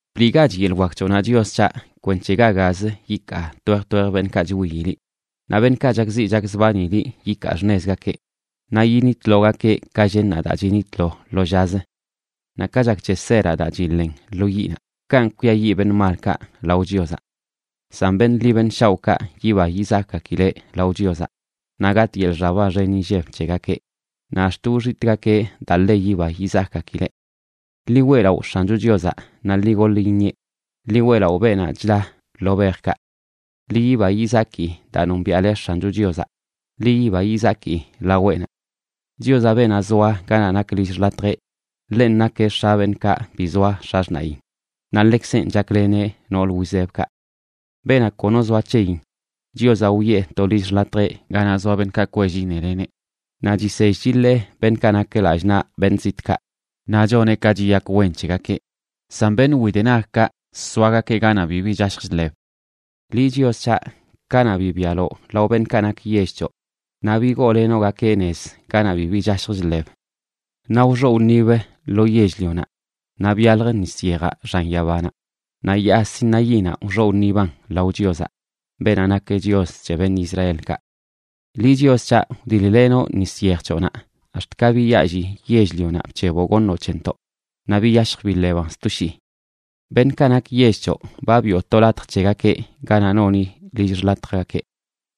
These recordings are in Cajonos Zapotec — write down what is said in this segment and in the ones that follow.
Bliꞌgach yeḻꞌ wak c̱hoꞌnaꞌ, Chios c̱haꞌ, kwenc̱he ga gaz yikaa twej twej beṉꞌkaꞌ chwiyi liꞌ, naꞌ beṉꞌkaꞌ chakziꞌ chakzbani liꞌ yikaa xṉezgakeꞌ. Naꞌ yinitlogakeꞌ, ka llennaꞌ daa chinitlo lo llazə. Naꞌ ka chak c̱he seraꞌ daa chiḻen lo yiꞌnaꞌ kanꞌ kwiayiꞌ beṉꞌ malkaꞌ lao Chiozaꞌ. San beṉꞌ ḻi beṉꞌ shaoꞌkaꞌ yiba yizakꞌgakileꞌ lao Chiozaꞌ; naꞌ gatꞌ yeḻꞌ xaba xen inlleb c̱hegakeꞌ naꞌ ax̱t wxitꞌgakeꞌ daa ḻe yiba yizakꞌgakileꞌ. Ḻi weꞌlaꞌo X̱ancho Chiozaꞌ naꞌ ḻi goḻ iṉieꞌ; ḻi weꞌlaꞌo beenaꞌ chda lo bejkaꞌ. Ḻi yiba yizaki daa nombiaꞌle X̱ancho Chiozaꞌ. Ḻi yiba yizaki laweꞌnaꞌ. Chiozaꞌ, beenaꞌ zoa ganaꞌ nak lill xḻatjeꞌ, ḻenꞌ nakeꞌ x̱a beṉꞌkaꞌ bi zoa x̱axṉaꞌyin, naꞌ ḻekzenꞌ chakleneꞌ nool wizebkaꞌ. Beenaꞌ kono zoa c̱heyin, Chiozaꞌ wiꞌe to lill xḻatjeꞌ ganaꞌ zoa beṉꞌkaꞌ kwell iṉeleneꞌ; naꞌ chisell chiḻee beṉꞌkaꞌ nak lallꞌ naꞌ beṉꞌ zitꞌkaꞌ, naꞌ choneꞌ ka chiyak wen c̱hegakeꞌ; san beṉꞌ widenagkaꞌ soagakeꞌ ganaꞌ bibi chashj chḻeb. Liꞌ, Chios c̱haꞌ, kanaꞌ bibialoꞌ lao beṉꞌkaꞌ nak yell c̱hoꞌ, naꞌ bigoolenoꞌgakeꞌ nez ganaꞌ bibi chashj chḻeb. Naꞌ wxoꞌ wṉibə lo yell-lionaꞌ, naꞌ byalj nis yejaꞌ xan yabanaꞌ, naꞌ Yaa Sinaínaꞌ wxoꞌ wṉiban lao Chiozaꞌ, beenaꞌ nak Chios c̱he beṉꞌ Israelkaꞌ. Liꞌ, Chios c̱haꞌ, wdil-lenoꞌ nis yej c̱hoꞌnaꞌ ax̱t ka biyaalli yell-lionaꞌ bc̱heboꞌ goṉoꞌ c̱hentoꞌ, naꞌ biyashj biḻeban sto shii. Beṉꞌkaꞌ nak yell c̱hoꞌ ba biꞌo to latj c̱hegakeꞌ ganaꞌ noni lill xḻatjgakeꞌ;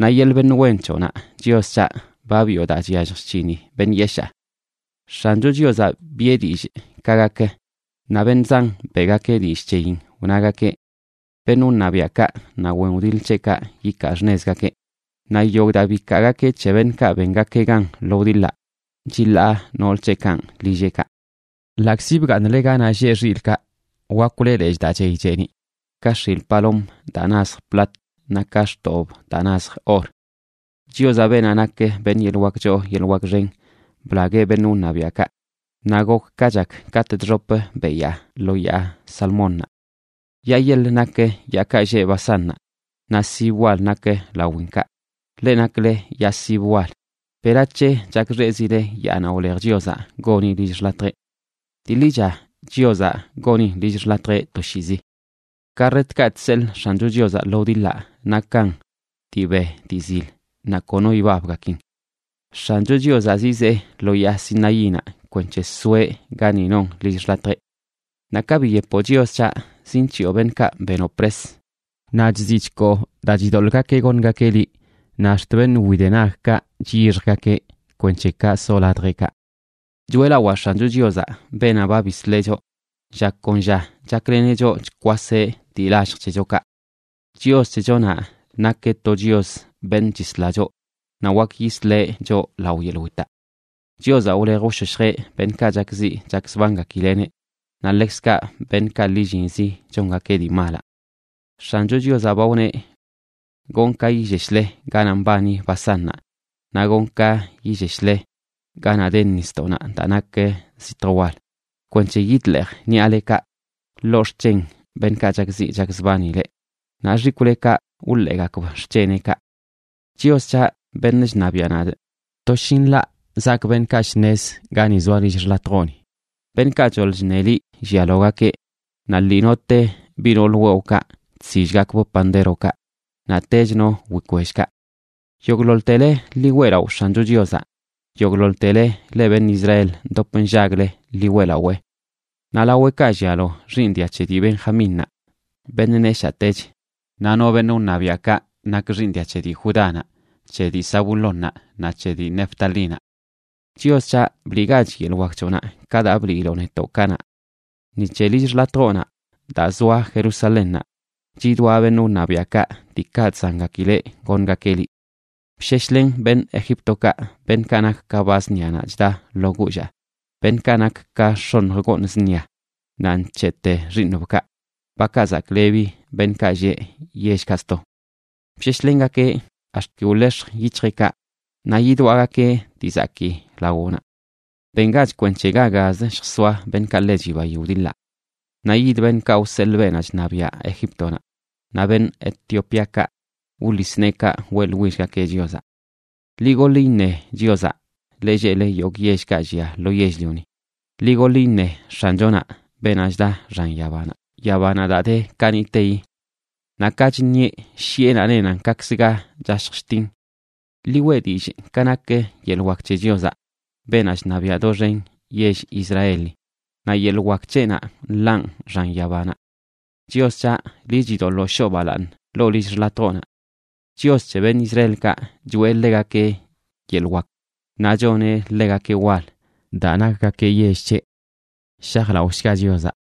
naꞌ yeḻꞌ beṉꞌ wen c̱hoꞌnaꞌ, Chios c̱haꞌ, ba biꞌo daa chyallj chc̱hini beṉꞌ yeshaa. X̱ancho Chiozaꞌ biꞌe dillꞌ ka gak, naꞌ beṉꞌ zan beꞌgakeꞌ dillꞌ c̱heyin, wnagakeꞌ: “¡Beṉꞌ wṉabiaꞌkaꞌ naꞌ wen wdiḻ c̱heꞌkaꞌ ikaa xṉezgakeꞌ!” Naꞌ yogꞌ daa bikaagakeꞌ c̱he beṉꞌkaꞌ bengakeꞌ gan lo wdiḻaꞌ chiḻaa nool c̱heꞌkanꞌ lilleꞌkaꞌ. Ḻaꞌkzi bgaaṉle ganaꞌ lleꞌ xilꞌkaꞌ, wakwle lechꞌ daa chey cheeniꞌ ka x̱il palom daa nazj plat, naꞌ ka xtobꞌb daa nazj or. Chiozaꞌ, beenaꞌ nak beṉꞌ yeḻꞌ wak choo yeḻꞌ wak xen, blagueꞌ beṉꞌ wṉabiaꞌkaꞌ, naꞌ gok ka chak katꞌ chxop beyaa lo Yaa Salmónnaꞌ. Yaa yeḻ nak yaakaꞌ lleꞌ Basánnaꞌ, naꞌ sib wal nak lawinkaꞌ. Leꞌ nakle yaa sib wal, ¿Berac̱he chakxeꞌzile yaanaꞌ wlej Chiozaꞌ goni lill x̱latjeꞌ? Dii ḻicha Chiozaꞌ gonin lill x̱latjeꞌ toshiizi. Karretkaꞌ chseḻꞌ X̱ancho Chiozaꞌ lo wdiḻaꞌ nakan dii be dii zil naꞌ kono ibabgakin. X̱ancho Chiozaꞌ zizee lo yaa Sinaínaꞌ kwenc̱he soeꞌ gani non lill x̱latjeꞌ. Naꞌ ka biyepoꞌ, Chios c̱haꞌ, zinc̱hiꞌo beṉꞌkaꞌ benoꞌ pres. Naꞌ chziꞌ chkoo daa chidoḻꞌgakeꞌ goṉgakeꞌ liꞌ, naꞌ ax̱t beṉꞌ widenagkaꞌ chyixjgakeꞌ, kwenc̱he kaꞌ soꞌ ladjeꞌkaꞌ. Choeꞌlawaa X̱ancho Chiozaꞌ, beenaꞌ ba bisleꞌ choꞌ, lla kon lla chakleneꞌ choꞌ chkwaseꞌ dii lallj c̱hechokaꞌ. Chios c̱hechonaꞌ nakeꞌ to Chios beṉꞌ chisla choꞌ. Naꞌ wak yisle choꞌ lao yeḻꞌ witaꞌ. Chiozaꞌ wlej wshoshjeꞌ beṉꞌkaꞌ chakziꞌ chakzbangakileꞌneꞌ naꞌ ḻekzkaꞌ beṉꞌkaꞌ lillinzi chongakeꞌ dii malaꞌ. X̱ancho Chiozaꞌ ba wneꞌ: “Gonꞌ ka yilleshle ganaꞌ mbani Basánnaꞌ, naꞌ gonꞌ ka yilleshle ganaꞌ de nisdoꞌnaꞌ daa nak sitj wal, kwenc̱he yidḻeej ṉiꞌalekaꞌ ḻoo xc̱hen beṉꞌkaꞌ chakziꞌ chakzbani leꞌ, naꞌ xikwꞌlekaꞌ wḻeegakb xc̱heneꞌkaꞌ.” Chios c̱haꞌ, beṉꞌ chṉabiaꞌ nadꞌ, toshinḻaꞌ zaak beṉꞌkaꞌ shṉez gani zoa lill xḻatjoꞌni. Beṉꞌkaꞌ choḻ chṉe liꞌ llialogakeꞌ naꞌ lii note biꞌ nool wewꞌkaꞌ chsillgakbꞌ pandérokaꞌ, naꞌtech no wikwellkaꞌ. ¡Yogꞌḻoḻtele, ḻi weꞌlaꞌo X̱ancho Chiozaꞌ! ¡Yogꞌḻoḻtele leꞌ beṉꞌ Israel ndop nllagle, ḻi weꞌlawee! Naꞌ laweꞌkaꞌ llialo xiiṉ dia c̱he dii Benjamínnaꞌ, beṉꞌ neshaꞌtech, naꞌ no beṉꞌ wṉabiaꞌkaꞌ nak xiiṉ dia c̱he dii Judánaꞌ, c̱he dii Zabulónnaꞌ, naꞌ c̱he dii Neftalínaꞌ. Chios c̱haꞌ, ¡bliꞌgach yeḻꞌ wak c̱hoꞌnaꞌ, ka daa ba bliiloꞌ netoꞌ kanaꞌ! Ni c̱he lill xḻatjoꞌnaꞌ daa zoa Jerusalénnaꞌ, chidwaꞌ beṉꞌ wṉabiaꞌkaꞌ diikaꞌ chzangakileꞌ goṉgakeꞌ liꞌ. Bsheshlen beṉꞌ Egíptokaꞌ, beṉꞌkaꞌ nak ka ba zṉianaꞌ chda ḻoo guullaꞌ, beṉꞌkaꞌ nak ka x̱oṉj gooṉ zṉia naꞌ nc̱heꞌte xiiṉbkaꞌ, bakaꞌ zaklebi beṉꞌkaꞌ lleꞌ yellkaꞌ sto. Bsheshlengakeꞌ ax̱t ki wḻex̱j yic̱hjeꞌkaꞌ, naꞌ yidwaꞌgakeꞌ dii zakii lawoꞌnaꞌ. ¡Bengach kwenc̱he ga gazə lljsoaꞌ beṉꞌkaꞌ ḻe chibayi wdiḻaꞌ! Naꞌ yid beṉꞌkaꞌ wseḻꞌ beenaꞌ chṉabiaꞌ Egíptonaꞌ, naꞌ beṉꞌ Etiopíakaꞌ wḻis neekaꞌ weꞌḻwillgakeꞌ Chiozaꞌ. ¡Ḻi goḻ iṉe Chiozaꞌ, le lleꞌle yogꞌ yellkaꞌ llia lo yell-lioni! Ḻi goḻ iṉe X̱anchonaꞌ, beenaꞌ chda xan yabanaꞌ, yabanaꞌ daa de kaniꞌteyi, naꞌ ka chṉieꞌ, shiꞌenaꞌ nenan kaꞌkzə ga chashj chtin. Ḻi weꞌ dillꞌ ka nak yeḻꞌ wak c̱he Chiozaꞌ, beenaꞌ chṉabiaꞌ doxen yell Israeli, naꞌ yeḻꞌ wak c̱heꞌnaꞌ nḻaꞌn xan yabanaꞌ. Chios c̱haꞌ, liꞌ chidoḻoo shoo balaaṉ ḻoo lill xḻatjoꞌnaꞌ. Chios c̱he beṉꞌ Israelkaꞌ, choꞌe ḻegakeꞌ yeḻꞌ wak naꞌ choneꞌ ḻegakeꞌ wal daa nakgakeꞌ yell c̱heꞌ. ¡Shajlaꞌoshga Chiozaꞌ!